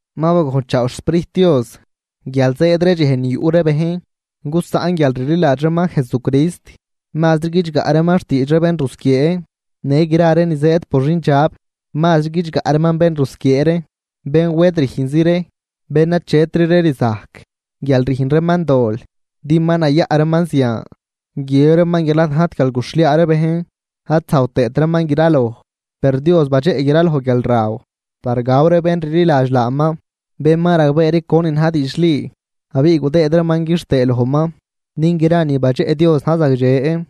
Ma bagojnchaaw xSprijt Dios guial zëëd ree dxej ni yuꞌ ree bejn gusaꞌn guialrliladx reeman Jesucrist, mazri guidxgaꞌ reeman xtiidx ree bénrusquiee në gra ree ni zëëd por xindxab. Mazri guidxgaꞌ reeman bénrusquiee ree, bén wed rüjnz ree, bén achetri ree rzajc guial rüjn reeman dol din ma nayaꞌ reeman zian. Guiëb reeman guial ad najt guial guxhliaa ree bejn ad zajw tëët reeman graloj. Per Dios badxeꞌ graloj guialraw par gaw ree bén rliladx laaman, bén ma ragbee ree conin na̱j diidxli abiꞌ gudëëd reeman quixtëe lojman. Din gra ni badxeꞌ Dios na̱j zagdxe,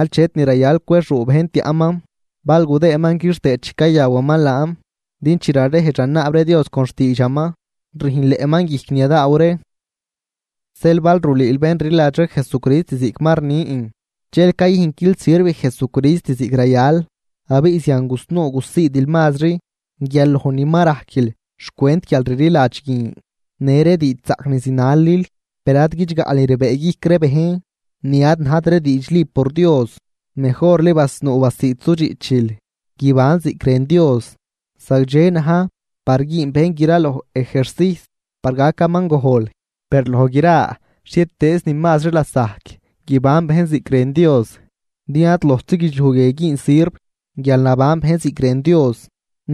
achet ni rayal cwexuu bejn tiaꞌman bal gudëëman quixtëë chi cayawaman laan. Din chi rarejdx ranaab ree Dios con xtiidxaman rüjnleꞌman guijc ni yadaaw ree. Zeel bal rulüül bén rliladx ree Jesucrist ziꞌc ma rnin, dxel cayüjnquil sirv Jesucrist ziꞌc rayal, abiꞌ zian gusnuu gusiidil mazri guial loj ni ma rajquil xcwent guialrliladx guin në ree diidxzaꞌc ni zinalil. Per ad guidxgaꞌl ni rbëëguijc ree bejn, ni ad najt ree diidxli por Dios, mejorli basnuu basiid sudxiꞌchil guibanl ziꞌc rën Dios. Zagdxe na̱j par güün bejn graloj ejercijs par gacaman gojl, per loj gra xhietëëznin mazri lasajc guiban bejn ziꞌc rën Dios. Din ad lojtzi guidxliuj guie güün sirv guial naban bejn ziꞌc rën Dios,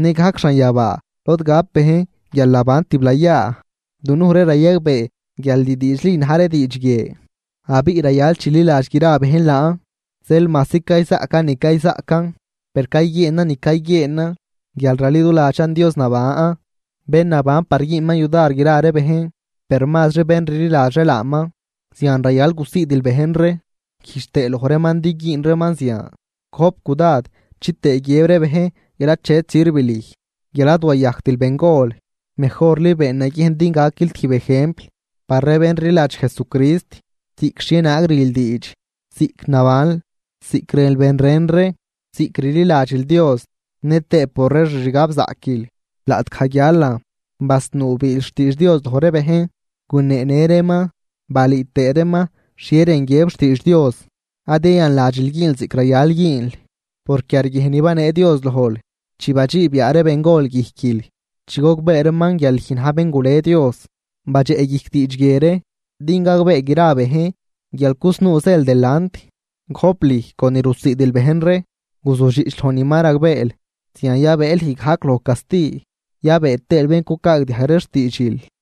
nëgajc xanyabaa lod gap bejn guialnaban tiblayaa. Dunuj ree rayagbee guial ni diidxli na̱j ree diidx guie, abiꞌ rayal chililadx gra bejn laan. Zeel majsi cayzaꞌcan ni cayzaꞌcan, per cayguieenan ni cayguieenan guial raliduladxan Dios naban, bén naban par güünman yudar gra ree bejn, per mazri bén rliladx ree laaman. Zian rayal gusiidil bejn ree güjdx tëë loj reeman din güün reeman zian. Gojp cudad chitëë guiëb ree bejn guial achet sirv lüj guial ad wayajctil bengol. Mejorli been naguiejn din gaquil tijb ejempl par ree bén rliladx Jesucrist, ziꞌc xhienaag rül diidx, ziꞌc nabanl, ziꞌc rënl ben ren ree, ziꞌc rliladxil Dios nëtëë por ree xixgabzaꞌquil. Laꞌtgaj guialan, basnuu biil xtiidx Dios loj ree bejn, guneenë reeman balüü tëë reeman xhie rën guiëb xtiidx Dios. Ad yayanladxil güünl ziꞌc rayal güünl por quiarguiejn ni banee Dios lojl chi badxiib yaa ree bengol guijquil chi gogbee reeman guial lüj na̱j bén gule Dios. Badxeꞌguijc diidx guie ree din gagbee gra ree bejn guial cusnuu zël delant. Gojp lüj con ni rusiidil bejn ree. Guzujdxiꞌch loj ni ma ragbeel, zian yabëë lüj gajc loj casti yabëë tëël bén cucaagdiajg ree xtiidxil.